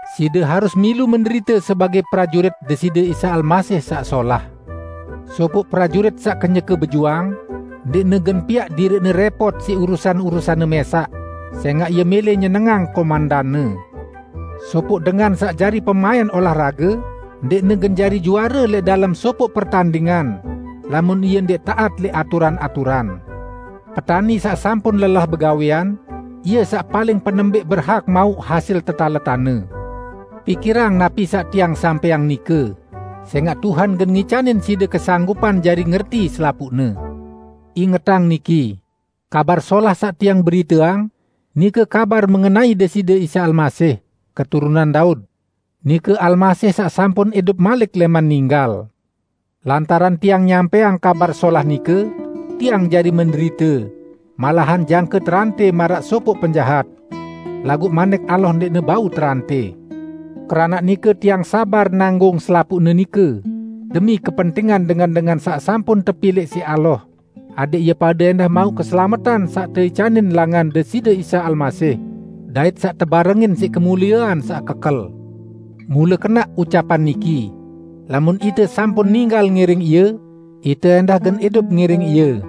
Side harus milu menderite sebagẽ prajurit Deside Isa Almasih saq solah. Sopoq prajurit saq kenyeke bejuang, ndẽqne gen piaq diriqne rẽpot siq urusan-urusanne mẽsaq, sẽngaq ie mẽlẽ nyenengang komendanne. Sopoq dengan saq jari pemaẽn olah rage ndẽqne gen jari juare lẽq dalem sopoq pertandingan, lamun ie ndẽq taat lẽq aturan-aturan. Petani saq sampun lelah begawẽan, ie saq paling penembẽq berhak mauq hasil tetaletanne. Pikirang napi saq tiang sampẽang nike, sẽngaq Tuhan gen ngicanin side kesanggupan jari ngerti selapuqne. Ingetang niki: Kabar Solah saq tiang beriteang, nike kabar mengenai Deside Isa Almasih, keturunan Daud; nike Almasih saq sampun idup malik lẽman ninggal. Lantaran tiang nyampẽang Kabar Solah nike, tiang jari menderite; malahan jangke terantẽ maraq sopoq penjahat. Laguq Manik Allah ndẽqne bau terantẽ. Keranaq nike tiang sabar nanggung selapuqne nike demi kepentingan dengan-dengan saq sampun tepilẽq siq Allah, adẽq ie pade ẽndah mauq keselametan saq teicanin langan Deside Isa Almasih, dait saq tebarengin siq kemuliean saq kekel. Mule kenaq ucapan niki, "Lamun ite sampun ninggal ngiring Ie, ite ẽndah gen idup ngiring Ie.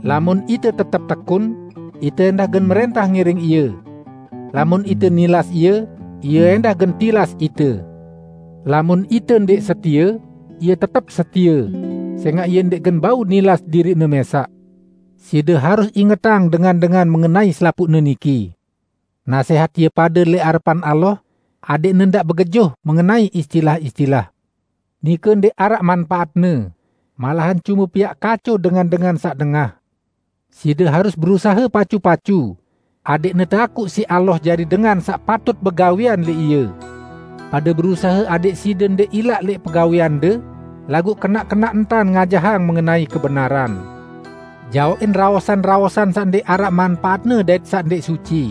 Lamun ite tetep tekun, ite ẽndah gen mrẽntah ngiring Ie. Lamun ite nilas Ie, Ie ẽndah gen tilas ite. Lamun ite ndẽq setie, Ie tetep setie, sẽngaq Ie ndẽq gen bau nilas diriq-Ne mẽsaq." Side harus ingetang dengan-dengan mengenai selapuqne niki. Nasẽhat ie pade lẽq arepan Allah, adẽqne ndaq begejuh mengenai istilah-istilah. Nike ndẽq araq manpaatne, malahan cume piaq kaco dengan-dengan saq dengah. Side harus berusahe pacu-pacu adẽqne teakuq siq Allah jari dengan saq patut begawẽan lẽq Ie. Pade berusahe adẽq side ndẽq ilaq lẽq pegawẽande, laguq kenaq-kenaq entan ngajahang mengenai kebenaran. Jaoqin raosan-raosan saq ndẽq araq manpaatne dait saq ndẽq suci.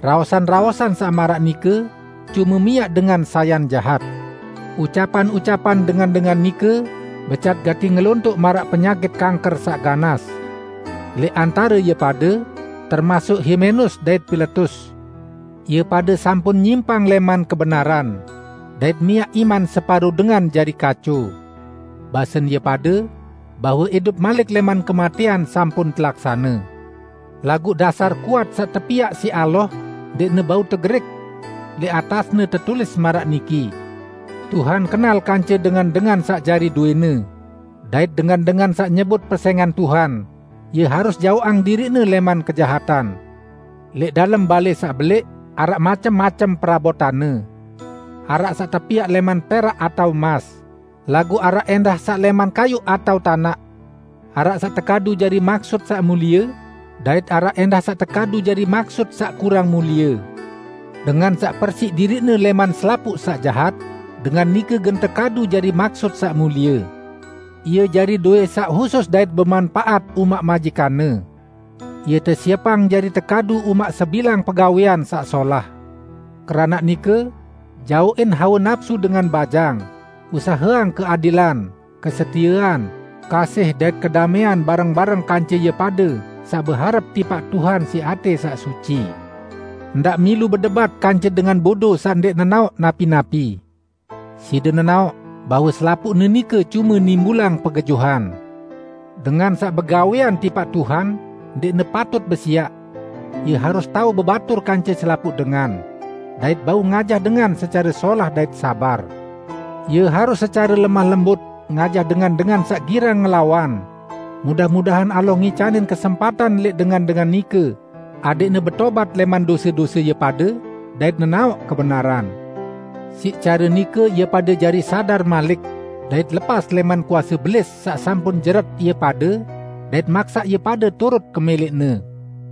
Raosan-raosan saq maraq nike cume miaq dengan sayan jahat. Ucapan-ucapan dengan-dengan nike becat gati ngelontoq maraq penyakit kangker saq ganas. Lẽq antare ie pade termasuk Himenus dait Piletus. Ie pade sampun nyimpang lẽman kebenaran, dait miaq iman separo dengan jari kaco. Basen ie pade bahwe idup malik lẽman kematẽan sampun telaksane. Laguq dasar kuat saq tepiaq siq Allah ndẽqne bau tegerik. Lẽq atasne tetulis maraq niki, "Tuhan kenal kance dengan-dengan saq jari dowẽ-Ne", dait, "Dengan-dengan saq nyebut pesẽngan Tuhan, ie harus jaoqang diriqne lẽman kejahatan." Lẽq dalem balẽ saq belẽq araq macem-macem perabotanne. Araq saq tepiaq lẽman perak atao emas, laguq araq ẽndah saq lẽman kayuq atao tanaq. Araq saq tekadu jari maksut saq mulie, dait araq ẽndah saq tekadu jari maksut saq kurang mulie. Dengan saq persiq diriqne lẽman selapuq saq jahat, dengan nike gen tekadu jari maksut saq mulie. Ie jari dowẽ saq husus dait bemanpaat umaq majikanne. Ie tesiepang jari tekadu umaq sebilang pegawẽan saq solah. Keranaq nike, jaoqin hawe napsu dengan bajang, usaheang keadilan, kesetiean, kasih dait kedamẽan bareng-bareng kance ie pade saq beharep tipaq Tuhan siq atẽ saq suci. Ndaq milu bedebat kance dengan bodo saq ndẽq nenaoq napi-napi. Side nenaoq bahwe selapuqne nike cume nimbulang pegejuhan. Dengan saq begawẽan tipaq Tuhan ndẽqne patut besiaq; ie harus tao bebatur kance selapuq dengan, dait bau ngajah dengan secare solah dait sabar. Ie harus secare lemah lembut ngajah dengan-dengan saq girang ngelawan; mudah-mudahan Allah ngicanin kesempatan lẽq dengan-dengan nike adẽqne betobat lẽman dose-dose ie pade dait nenaoq kebenaran. Siq care nike ie pade jari sadar malik, dait lepas lẽman kuase Belis saq sampun jeret ie pade dait maksaq ie pade turut kemẽlẽqne.